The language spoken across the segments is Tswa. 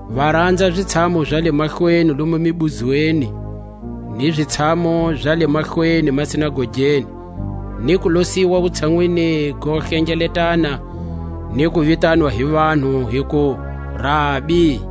Va ranza a zitshamu za le mahlweni lomu mibuzweni, ni zitshamu za le mahlweni masinagogeni, ni kuloswa wutshanwini go hlengeletana, ni ku vitanwa hi vanhu hiku: Rabi!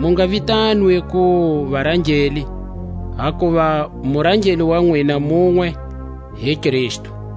Mu nga vitanwi ku varangeli; hakuva murangeli wa nwina munwe, hi Kristu.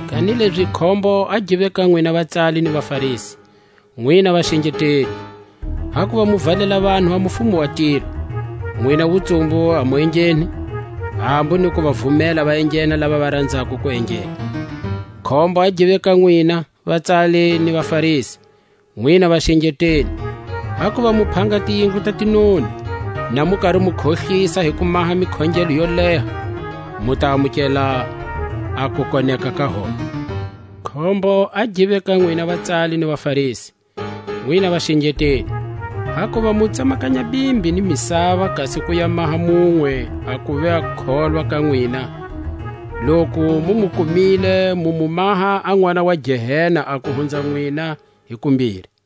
Kanilezi khombo a give ka nwina vatsali ni vaFarisi, nwina vaxengeteli! Hakuva mu valela vanhu a mufumo wa tilo; nwina wutsumbu a mu engheni, hambu ni ku va vumela va enghena lava va ranzako ku enghena. Khombo a give ka nwina vatsali ni vaFarisi, nwina vaxengeteli! Hakuva mu phanga tiyindlu ta tinoni, na mu kari mu khohlisa hi ku maha mikhongelo yo leha; mu ta amukela a kukoneka ka hombe. Khombo a give ka nwina vatsali ni vaFarisi, nwina vaxengeteli! Hakuva mu tsemakanya bimbi ni misava kasi ku ya maha munwe a kuva kholwa ga nwina; loku mu mu kumile, mu mu maha a nʼwana wa Gehena a ku hunza nwina hi kumbiri.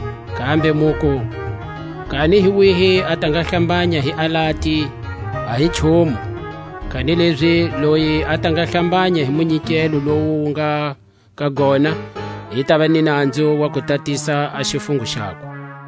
Kambe muku; Kani hi wihi a ta nga hlambanya hi alati, a hi nchumu; kanilezi loyi a ta nga hlambanya hi munyikelo lowu wu nga ka gona i tava ni nanzu wa ku tatisa a xifungo xakwe.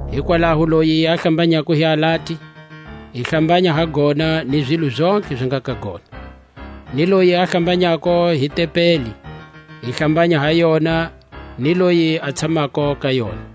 Hikwalaho loyi a hlambanyako hi alati, i hlambanya ha gona ni zilo zontlhe zi nga ka gona. Ni loyi a hlambanyako hi tempeli, i hlambanya ha yona ni loyi a tshamako ka yona.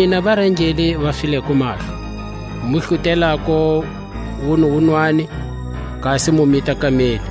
Nwina varangeli va fileko mahlo, mu hlutelako wunuwunwani, kasi mu mita kameli.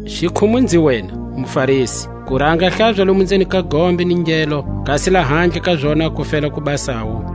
Xikhumu-nzi-wena muFarisi! kuranga hlaza lomu nzeni ka gombe ni ngelo, kasi lahandle ka zona ku fela ku basawu.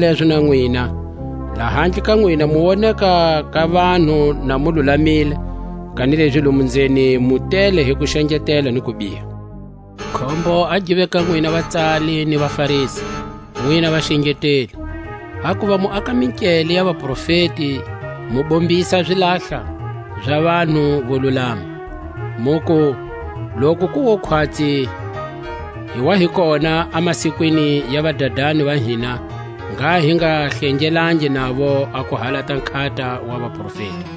Hizalezo na nwina, lahandle ka nwina mu woneka ka vanhu na mu lulamile, kanilezi lomu nzeni mu tele hi kuxengetela ni kubiha. Khombo a give ka nwina vatsali ni vaFarisi, nwina vaxengeteli! Hakuva mu aka minkele ya vaprofeti, mu bombisa a zilahla za vanhu vo lulama, muku: Loku ku wo khwatsi hi wa hi kona a masikwini ya vadadani va hina, ngha hi nga hlengelangi navo a ku halata nkhata wa vaprofeti.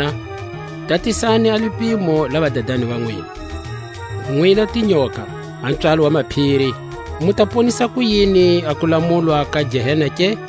Hizona, tatisani a lipimo la vadadani va nwina. Nwina tinyoka, a pswalo wa maphiri, mu ta ponisa kuyini a kulamulwa ka Gehena ke?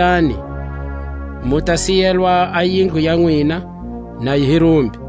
Langutani, mu ta siyelwa a yindlu ya nwina, na yi hi rumbi.